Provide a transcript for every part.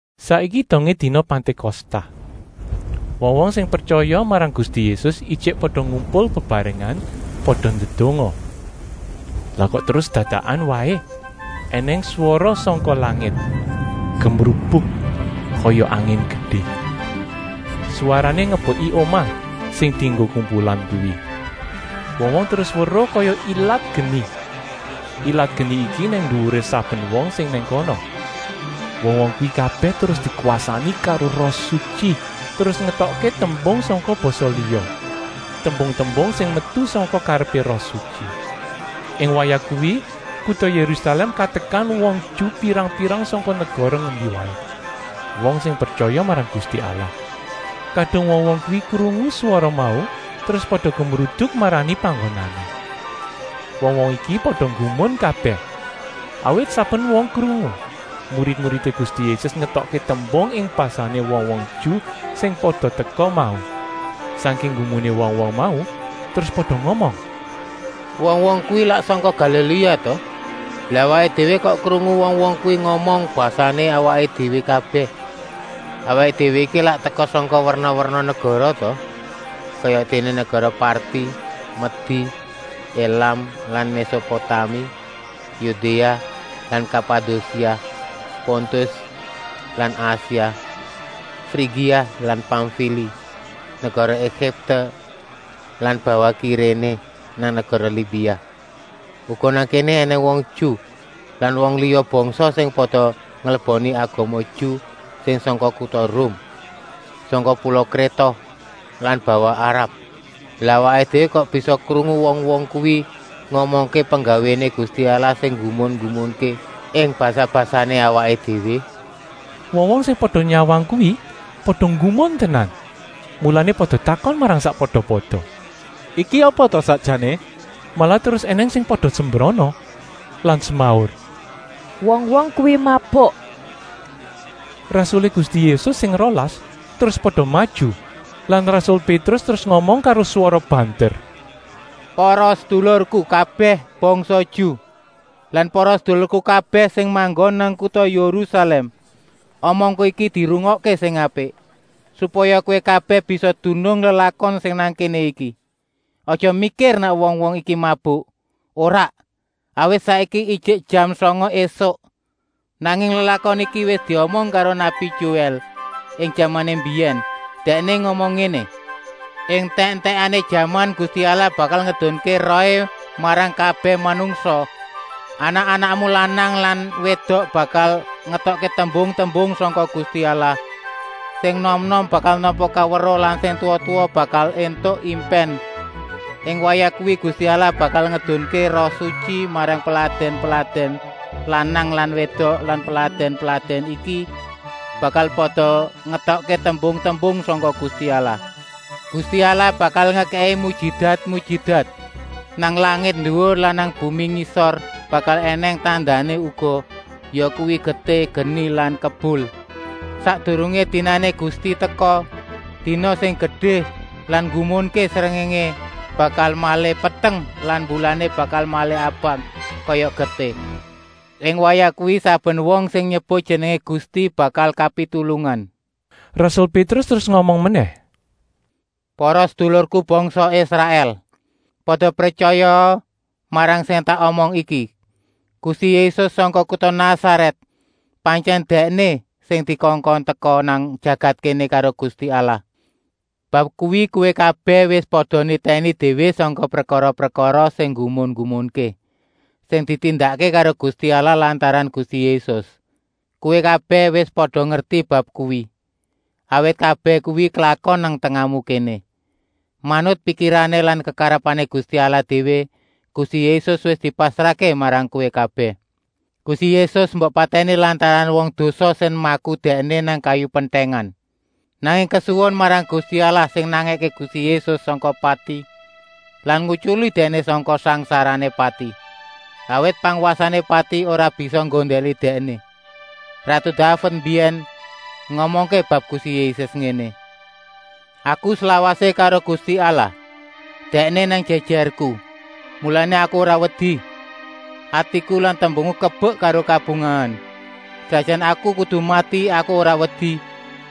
Saiki dongé dina Pantékosta. Wong-wong sing pretyaya marang Gusti Yésus ijik pada ngumpul bebarengan, pada ndedonga. Lah kok terus dadakan waé ènèng swara sangka langit, gemrubuk kaya angin gedé. Swarané ngebeki omah sing dienggo kumpulan kuwi. Wong-wong terus weruh kaya ilat geni. Ilat geni iki nang nduwuré saben wong sing nang kono. Wong-wong kuwi kabèh terus dikwasani karo Roh Sutyi, terus ngetokké tembung sangka basa liya, tembung-tembung sing metu sangka karepé Roh Sutyi. Ing wayah kuwi kuta Yérusalèm katekan wong Ju pirang-pirang sangka negara ngendi waé, wong sing pretyaya marang Gusti Allah. Kadung wong-wong kuwi krungu swara mau terus pada gemruduk marani panggonané. Wong-wong iki pada nggumun kabèh, awit saben wong krungu murid-muridé Gusti Yésus ngetokké tembung ing basané wong-wong Ju sing pada teka mau. Sangking nggumuné wong-wong mau terus pada ngomong: “Wong-wong kuwi lak sangka Galiléa ta? Lah awaké déwé kok krungu wong-wong kuwi ngomong basané awaké déwé kabèh? Awaké déwé iki lak teka sangka werna-werna negara ta, kayadéné negara Parti, Medi, Elam lan Mésopotami, Yudéa lan Kapadosia, Pontus lan Asia, Frigia lan Pamfili, negara Egipte lan bawah Kiréné nang negara Libia. Uga nang kéné ènèng wong Ju lan wong liya bangsa sing pada ngleboni agama Ju sing sangka kuta Rum, sangka pula Kréta lan bawah Arab. Lah awaké déwé kok bisa krungu wong-wong kuwi ngomongké penggawéné Gusti Allah sing nggumun-nggumunké ing basa-basané awaké déwé?” Wong-wong sing pada nyawang kuwi pada nggumun tenan, mulané pada takon marang sakpada-pada: “Iki apa ta sakjané?” Malah terus ènèng sing pada sembrana lan semaur: “Wong-wong kuwi mabuk!” Rasulé Gusti Yésus sing rolas terus pada maju lan rasul Pétrus terus ngomong karo swara banter: “Para sedulurku kabèh bangsa Ju lan para sedulurku kabèh sing manggon nang kuta Yérusalèm, omongku iki dirungokké sing apik, supaya kowé kabèh bisa dunung lelakon sing nang kéné iki. Aja mikir nèk wong-wong iki mabuk, ora, awit saiki ijik jam sanga ésuk. Nanging lelakon iki wis diomong karo nabi Joèl ing jamané mbiyèn. Dèkné ngomong ngéné: ‘Ing entèk-entèkané jaman Gusti Allah bakal ngedunké Rohé marang kabèh manungsa. Anak-anakmu lanang lan wédok bakal ngetokké tembung-tembung sangka Gusti Allah. Sing enom-enom bakal nampa kaweruh lan sing tuwa-tuwa bakal éntuk impèn. Ing wayah kuwi Gusti Allah bakal ngedunké Roh Sutyi marang peladèn-peladèn lanang lan wédok lan peladèn-peladèn iki bakal pada ngetokké tembung-tembung sangka Gusti Allah. Gusti Allah bakal ngekèki mujijat-mujijat nang langit nduwur lan nang bumi ngisor bakal ènèng tandané uga, yakuwi getih, geni lan kebul. Sakdurungé dinané Gusti teka, dina sing gedé lan nggumunké, srengéngé bakal malih peteng lan mbulané bakal malih abang kaya getih. Ing wayah kuwi saben wong sing nyebut jenengé Gusti bakal kapitulungan.’” Rasul Pétrus terus ngomong menèh: “Para sedulurku bangsa Israèl! Pada pretyayaa marang sing tak omong iki. Gusti Yésus sangka kuta Nasarèt, pantyèn Dèkné sing dikongkon teka nang jagat kéné karo Gusti Allah. Bab kuwi kowé kabèh wis pada nitèni déwé sangka prekara-prekara sing nggumun-nggumunké, sing ditindakké karo Gusti Allah lantaran Gusti Yésus. Kowé kabèh wis pada ngerti bab kuwi, awit kabèh kuwi klakon nang tengahmu kéné. Manut pikirané lan kekarepané Gusti Allah déwé Gusti Yésus wis dipasrahké marang kowé kabèh. Gusti Yésus mbok patèni lantaran wong dosa sing maku Dèkné nang kayu pentèngan. Nanging kesuwun marang Gusti Allah sing nangèké Gusti Yésus sangka pati lan ngutyuli Dèkné sangka sangsarané pati, awit pangwasané pati ora bisa nggondèli Dèkné. Ratu Daved mbiyèn ngomongké bab Gusti Yésus ngéné: ‘Aku slawasé karo Gusti Allah, Dèkné nang jèjèrku, mulané Aku ora wedi. Atiku lan tembungku kebek karo kabungahan. Senajana Aku kudu mati, Aku ora wedi,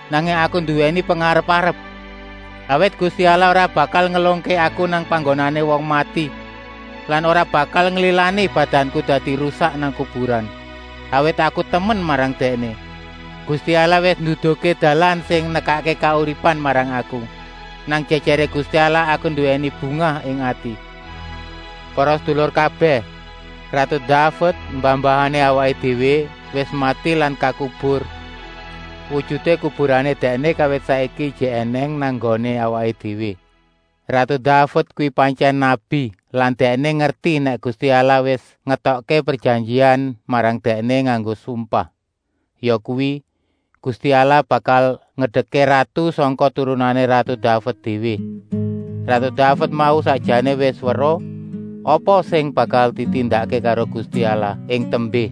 nanging Aku nduwèni pengarep-arep. Awit Gusti Allah ora bakal ngelungké Aku nang panggonané wong mati lan ora bakal nglilani badanku dadi rusak nang kuburan, awit Aku temen marang Dèkné. Gusti Allah wis nduduhké dalan sing nekakké kauripan marang Aku. Nang jèjèré Gusti Allah Aku nduwèni bungah ing ati.’ “Para sedulur kabèh, ratu Daved, mbah-mbahané awaké déwé, wis mati lan kakubur. Wujuté kuburané dèkné kawit saiki ijik ènèng nang nggoné awaké déwé. Ratu Daved kuwi pantyèn nabi lan dèkné ngerti nèk Gusti Allah wis ngetokké prejanjian marang dèkné nganggo sumpah, yakuwi, Gusti Allah bakal ngedekké ratu sangka turunané ratu Daved déwé. Ratu Daved mau sakjané wis weruh apa sing bakal ditindakké karo Gusti Allah ing tembé.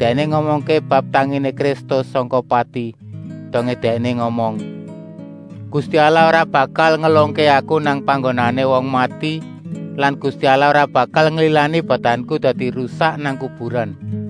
Dèkné ngomongké bab tanginé Kristus sangka pati, dongé dèkné ngomong: ‘Gusti Allah ora bakal ngelungké aku nang panggonané wong mati lan Gusti Allah ora bakal nglilani badanku dadi rusak nang kuburan.’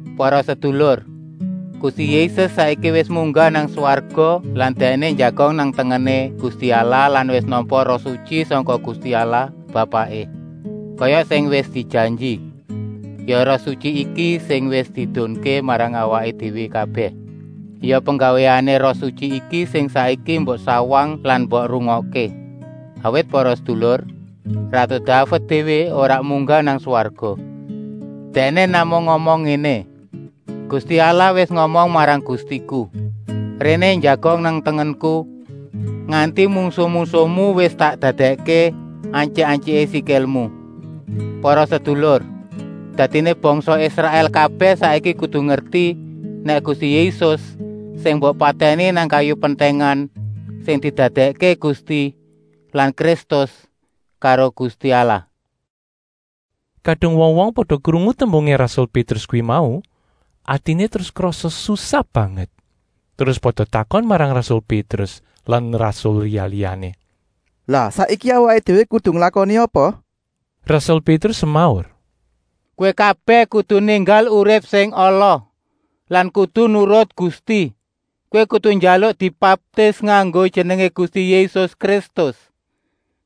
Para sedulur, Gusti Yésus saiki wis munggah nang swarga lan Dèkné njagong nang tengené Gusti Allah lan wis nampa Roh Sutyi sangka Gusti Allah Bapaké, kaya sing wis dijanji. Ya Roh Sutyi iki sing wis diedunké marang awaké déwé kabèh. Ya penggawéané Roh Sutyi iki sing saiki mbok sawang lan mbok rungokké. Awit para sedulur, ratu Daved déwé ora munggah nang swarga, dèkné namung ngomong ngéné: ‘Gusti Allah wis ngomong marang Gustiku: Réné njagong nang tengenku. Nganti mungsuh-mungsuhmu wis tak dadèkké antyik-antyiké sikilmu.’ “Para sedulur, dadiné bangsa Israèl kabèh saiki kudu ngerti, nèk Gusti Yésus sing mbok patèni nang kayu pentèngan, sing didadèkké Gusti lan Kristus karo Gusti Allah.” Kadung wong-wong pada krungu tembungé rasul Pétrus kuwi mau, atiné terus krasa susah banget. Terus pada takon marang rasul Pétrus lan rasul liya-liyané: “Lah saiki awaké déwé kudu nglakoni apa?” Rasul Pétrus semaur: “Kowé kabèh kudu ninggal urip sing ala lan kudu nurut Gusti. Kowé kudu njaluk dibaptis nganggo jenengé Gusti Yésus Kristus,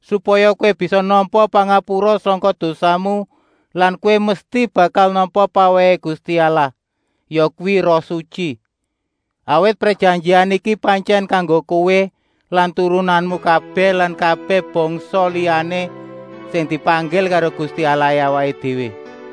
supaya kowé bisa nampa pangapura sangka dosamu lan kowé mesti bakal nampa pawèhé Gusti Allah, yakuwi Roh Sutyi. Awit prejanjian iki pantyèn kanggo kowé lan turunanmu kabèh lan kabèh bangsa liyané sing dipanggil karo Gusti Allahé awaké déwé.”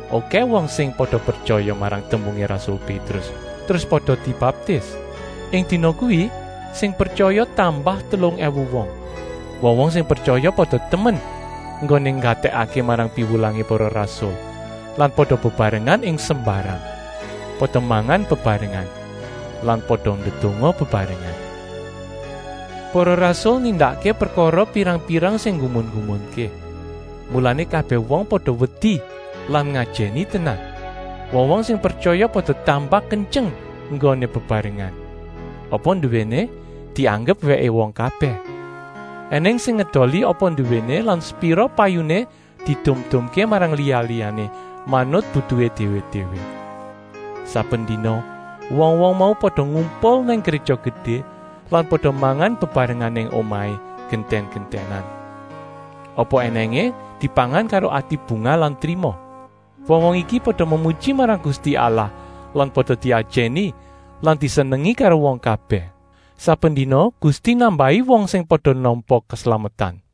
Okèh wong sing pada pretyaya marang tembungé rasul Pétrus, terus pada dibaptis. Ing dina kuwi sing pretyaya tambah telung èwu wong. Wong-wong sing pretyaya pada temen enggoné nggatèkké marang piwulangé para rasul lan pada bebarengan ing sembarang, pada mangan bebarengan lan pada ndedonga bebarengan. Para rasul nindakké prekara pirang-pirang sing nggumun-nggumunké, mulané kabèh wong pada wedi lan ngajèni tenan. Wong-wong sing pretyaya pada tambah kentyeng enggoné bebarengan. Apa nduwéné dianggep wèké wong kabèh. Enèng sing ngedoli apa nduwéné lan sepira payuné diedum-edumké marang liya-liyané, manut butuhé déwé-déwé. Saben dina wong-wong mau pada ngumpul nang Gréja Gedé lan pada mangan bebarengan nang omahé, gentèn-gentènan. Apa ènèngé dipangan karo ati bungah lan trima. Wong-wong iki pada memuji marang Gusti Allah lan pada diajèni lan disenengi karo wong kabèh. Saben dina Gusti nambahi wong sing pada nampa keslametan.